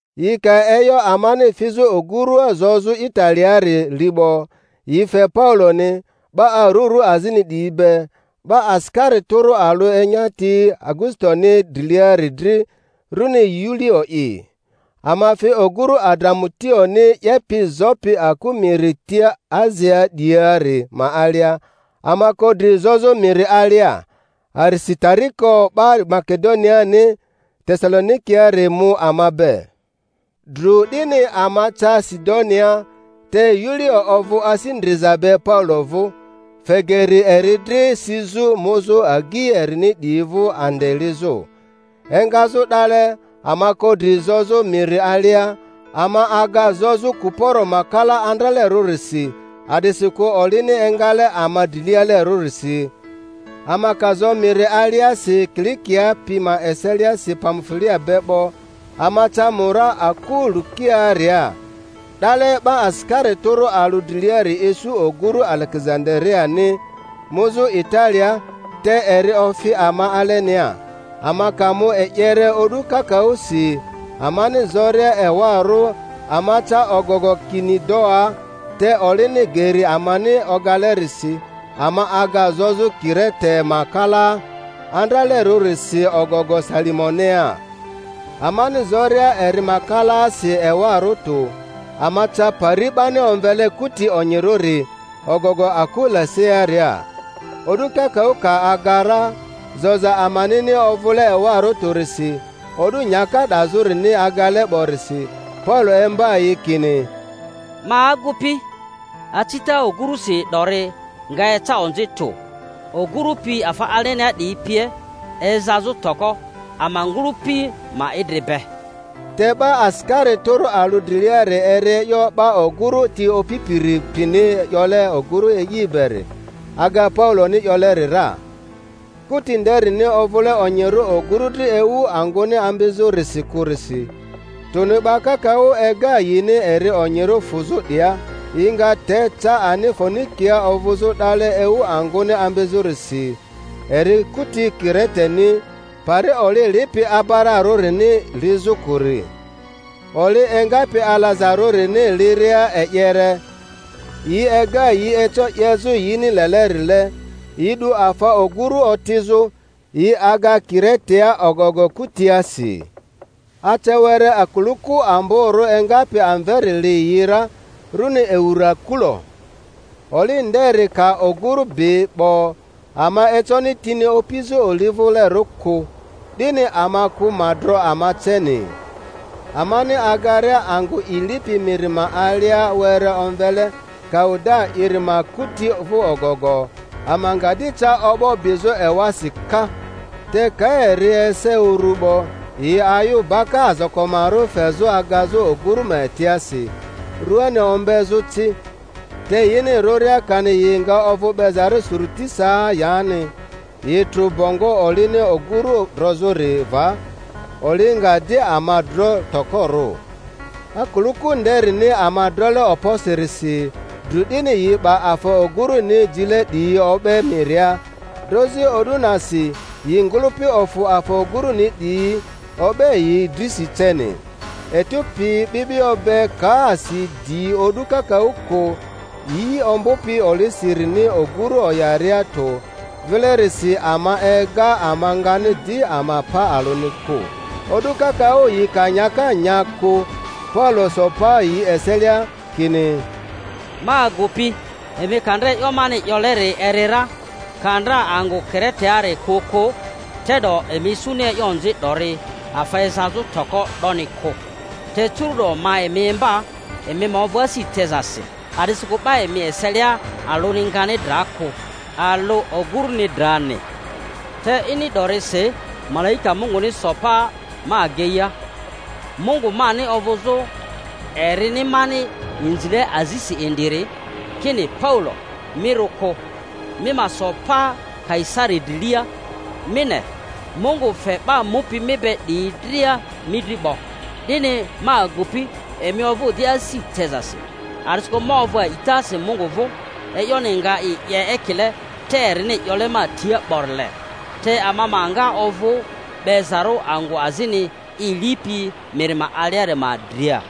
Yi ka e'yo amani fizᴜ ogurua zozᴜ Italiaari li 'bo, yi fe Pauloni, 'ba arurᴜ azini 'diyi be, 'ba asikari tᴜrᴜ alᴜ enyati Augusitoni driliari dri, runi Yulio'i. Ama fi ogurᴜ Adramutioni 'yepi zopi aku miri tia Asiaa 'diyiari ma alia, ama ko dri zozᴜ miri alia. Arisitariko 'ba Makedoniani Tesalonikiari mu ama be. Dru 'dini ama ca Sidonia; te Yulio ovᴜ asi ndriza be Paulo vᴜ, fe geri eri dri sizᴜ muzᴜ agyi erini 'diyi vᴜ ande lizᴜ. Engazᴜ 'dale ama ko dri zozᴜ miri alia, ama aga zozᴜ Kuporo ma kalaa andralerᴜrisi, a'disikᴜ olini engale ama drilialerᴜ risi. Ama ka zo miri aliasi Kilikia pi ma eseliasi Pamfulia be 'bo, ama ca Mura aku Lukiaaria. 'Dale 'ba asikari tᴜrᴜ alᴜ driliari isu oguru Alegezandariani muzᴜ Italia, te eri ofi ama alenia. Ama ka mu e'yere o'du kakaᴜsi, amani zoria ewarᴜ ama ca ogogo Kinidoa, te olini geri amani ogalerisi, ama aga zozᴜ Kirete ma kalaa andralerᴜrisi ogogo Salimonea. Amani zoria eri ma kalaasi ewarᴜ tᴜ, ama ca pari 'bani omvele Kuti Onyirᴜri, ogogo aku Lasearia. O'du kakaᴜ ka aga ra, zoza amanini ovᴜle ewarᴜ tᴜrisi, o'du nyaka 'dazᴜrini agale 'borisi, Paulo imba yi kini, Ma agupi, acita ogurusi 'dori nga eca onzi tᴜ, ogurᴜ pi afa alenia 'diyi pie ezazᴜ toko, ama ngᴜlᴜpi ma idri be. Te 'ba asikari tᴜrᴜ alᴜ driliari eri e'yo 'ba ogᴜru ti opipiri pini 'yole ogᴜru e'i beri, aga Pauloni 'yoleri ra. Kuti nderini ovᴜle onyirᴜ ogurᴜ dri ewu angᴜni ambizᴜrisi kᴜrisi, tᴜni 'ba kakaᴜ ega yini eri onyirᴜ fᴜzᴜ 'dia, yi nga te ca ani Foenikia ovᴜzᴜ 'dale ewu angᴜni ambizᴜrisi; eri kuti Kireteni, pari oli lipi abararᴜrini lizᴜ kᴜri. Oli engapi alazarᴜrini liria e'yere, yi ega yi eco 'yezᴜ yini lelerile, yi 'du afa oguru otizᴜ, yi aga Kiretea ogogo kutiasi. Ace were akuluku amborᴜ engapi amveri li yi ra, runi Eurakulo. Oli nderi ka oguru bi 'bo, ama econi tini opizᴜ olivᴜlerᴜ kᴜ, 'dini ama kᴜ ma dro ama ceni. Amani agaria angᴜ i lipi miri ma alia were omvele Kauda'iri ma kuti vᴜ ogogo, ama nga di ca o'bo bizᴜ ewasi ka; te ka eri ese uru 'bo, yi ayᴜ baka azakomarᴜ fezᴜ agazᴜ ogurᴜ ma etiasi, rᴜani ombezᴜ ci; te yini rᴜria kani yi nga ovᴜ 'bezarᴜ Suritisaa yani, yi trᴜ bongo olini ogurᴜ drozᴜri va, oli nga di ama dro tokorᴜ. Akuluku nderini ama drole okposirisi, dru 'dini yi 'ba afa ogurᴜni jile 'diyi o'be miria; drozi o'du nasi yi ngᴜlᴜpi ofᴜ afa ogᴜruni 'diyi, o'be yi drisi ceni. Etu pi 'bi'bio be ka asi di o'du kakaᴜ kᴜ, yi ombᴜpi olisirini ogᴜru oyaria tᴜ, vilerisi ama ega ama ngani di ama pa alᴜni kᴜ. O'du kakaᴜ yi ka nyaka nya kᴜ, Paulo so pa yi eselia, kini, Ma agupi, emi ka ndra e'yo mani 'yoleri eri ra, ka ndra angᴜ Kireteari kᴜ kᴜ, te'do emi isuni e'yo onzi 'dori, afa ezazᴜ toko 'doni kᴜ. Te curu'do ma emi imba, emi ma ovᴜ asi tezasi; a'disikᴜ 'ba emi eselia alᴜni ngani dra kᴜ, alᴜ oguruni drani. Te ini 'dorisi malaika Munguni so pa ma ageia, Mungu mani ovᴜzᴜ erini mani inzile azisi indiri, kini, Paulo, mi rᴜ kᴜ; mi ma so pa Kaisari drilia; mi ne, Mungu fe 'ba mupi mi be 'diyi dria mi dri 'bo. 'Dini, ma agupi, emi ovᴜ di asi tezasi. a'disikᴜ ma ovᴜ a'itasi Mungu vᴜ e'yoni nga i 'ye ekile te erini 'yole ma tia 'borile. Te ama ma nga ovᴜ 'bezarᴜ angᴜ azini i lipi miri ma aliari ma dria.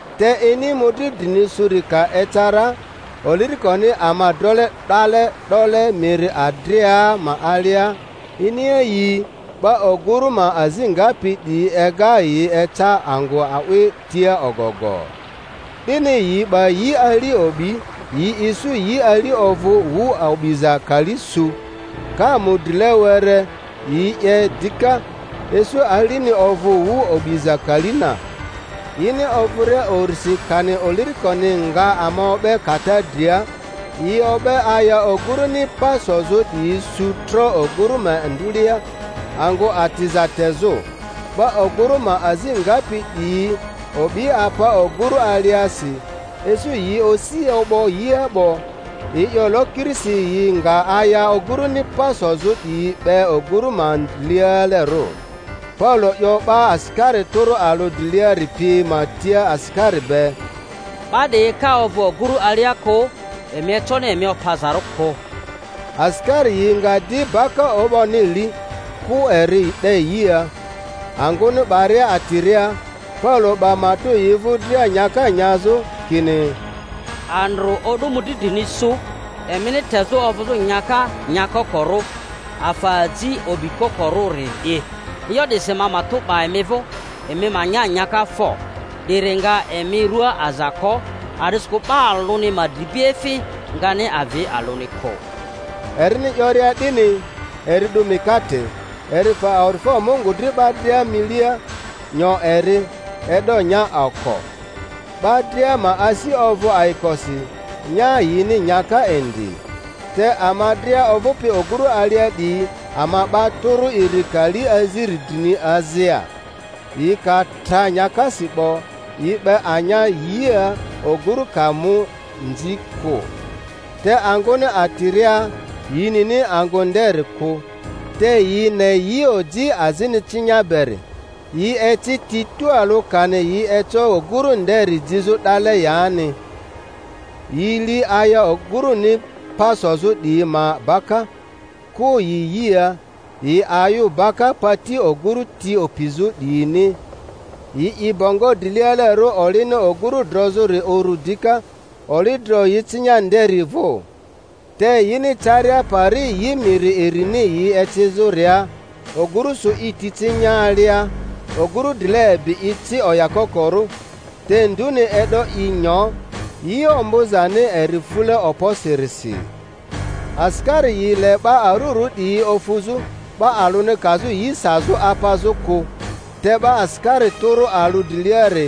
Te ini mᴜdri drini suri ka eca ra, olirikoni ama drole 'dale 'dole miri Adria ma alia, iniayii 'ba ogurᴜ ma azi ngapi 'diyi ega yi eca angᴜ a'wi tia ogogo. 'Dini yi 'ba yi ali o'bi, yi isu yi ali ovᴜ wu o'biza kali su; ka mu drile were yi 'ye dika, isu alini ovᴜ wu o'biza kali na. Yini ovᴜria urisi kani olirikoni nga ama o'be kata dria, yi o'be aya oguruni pa sozᴜ 'diyi su tro oguru ma ndulea, angᴜ atiza tezᴜ. 'Ba oguru ma azi ngapi 'diyi o'bi apa ogurᴜ aliasi, isu yi osi o'bo yia 'bo, yi 'yo lokirisi yi nga aya oguruni pa sozᴜ 'diyi 'be ogᴜru ma drilialerᴜ; Paulo 'yo 'ba asikari tᴜrᴜ alᴜ driliari pi ma tia asikari be, 'Ba 'diyi ka ovᴜ oguru alia kᴜ, emi econi emi opazarᴜ kᴜ. Asikari yi nga di baka o'boni li, kᴜ eri 'de yia. Angᴜni 'baria atiria, Paulo 'ba matᴜ yi vᴜ dria nyaka nyazᴜ, kini, Andrᴜ o'du mᴜdri drini su emini tezᴜ ovᴜzᴜ nyaka nyakokorᴜ, afa aji o'bikokorᴜri'i. E'yo 'disi ma matᴜ 'ba emi vᴜ, emi nya nyaka fo; 'diri nga emi rᴜa aza ko, a'disikᴜ 'ba alᴜni ma dribiefi ngani avi alᴜni kᴜ. Erini 'yoria 'dini, eri 'du mikate, eri fe awa'difo Mungu dri 'ba dria milia, nyo eri, e'do nya oko. 'Ba dria ma asi ovᴜ ayikosi, nya yini nyaka indi. Te ama dria ovᴜpi ogᴜru alia 'diyi, ama 'ba tᴜrᴜ iri kali aziri drini azia. Yi ka tra nyakasi 'bo, yi 'be anya yia ogᴜrᴜ ka mu nzi kᴜ. Te angᴜni atiria, yi nini angᴜ nderi kᴜ, te yi ne yioji azini cinya beri; yi eci ti tualᴜ kani yi eco oguru nderi jizᴜ 'dale yani. Yi li aya oguruni pa sozᴜ 'diyi ma baka, kᴜ yi yia, yi ayᴜ baka pati oguru ti opizᴜ 'diyini; yi 'i bongo drilialerᴜ olini ogurᴜ drozᴜri uru dika, oli dro yi cinya nderi vᴜ. Te yini ecaria pari yi miri irini yi ecizᴜria, oguru sᴜ i ti cinya alia; oguru drile ebi i ci oyakokorᴜ, te nduni e'do i nyo, yi ombᴜzani eri fule okposirisi. Asikari yi le 'ba arurᴜ 'diyi ofuzᴜ, 'ba alᴜni kazᴜ yi sazᴜ apazᴜ kᴜ; te 'ba asikari tᴜrᴜ alᴜ driliari,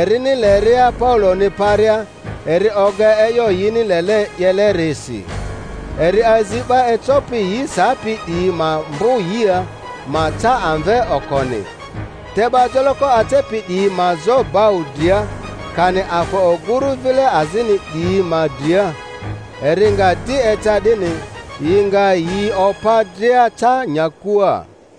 erini leria Pauloni paria, eri oga e'yo yini lele 'yeleri si. Eri azi 'ba ecopi yi sapi 'diyi ma mbᴜ yia, ma ca amve okoni, te 'ba joloko acepi 'diyi ma zo bau dria, kani afa oguru vile azini 'diyi ma dria. Eri nga di eca 'dini, yi nga yi opa dria ca nyakua.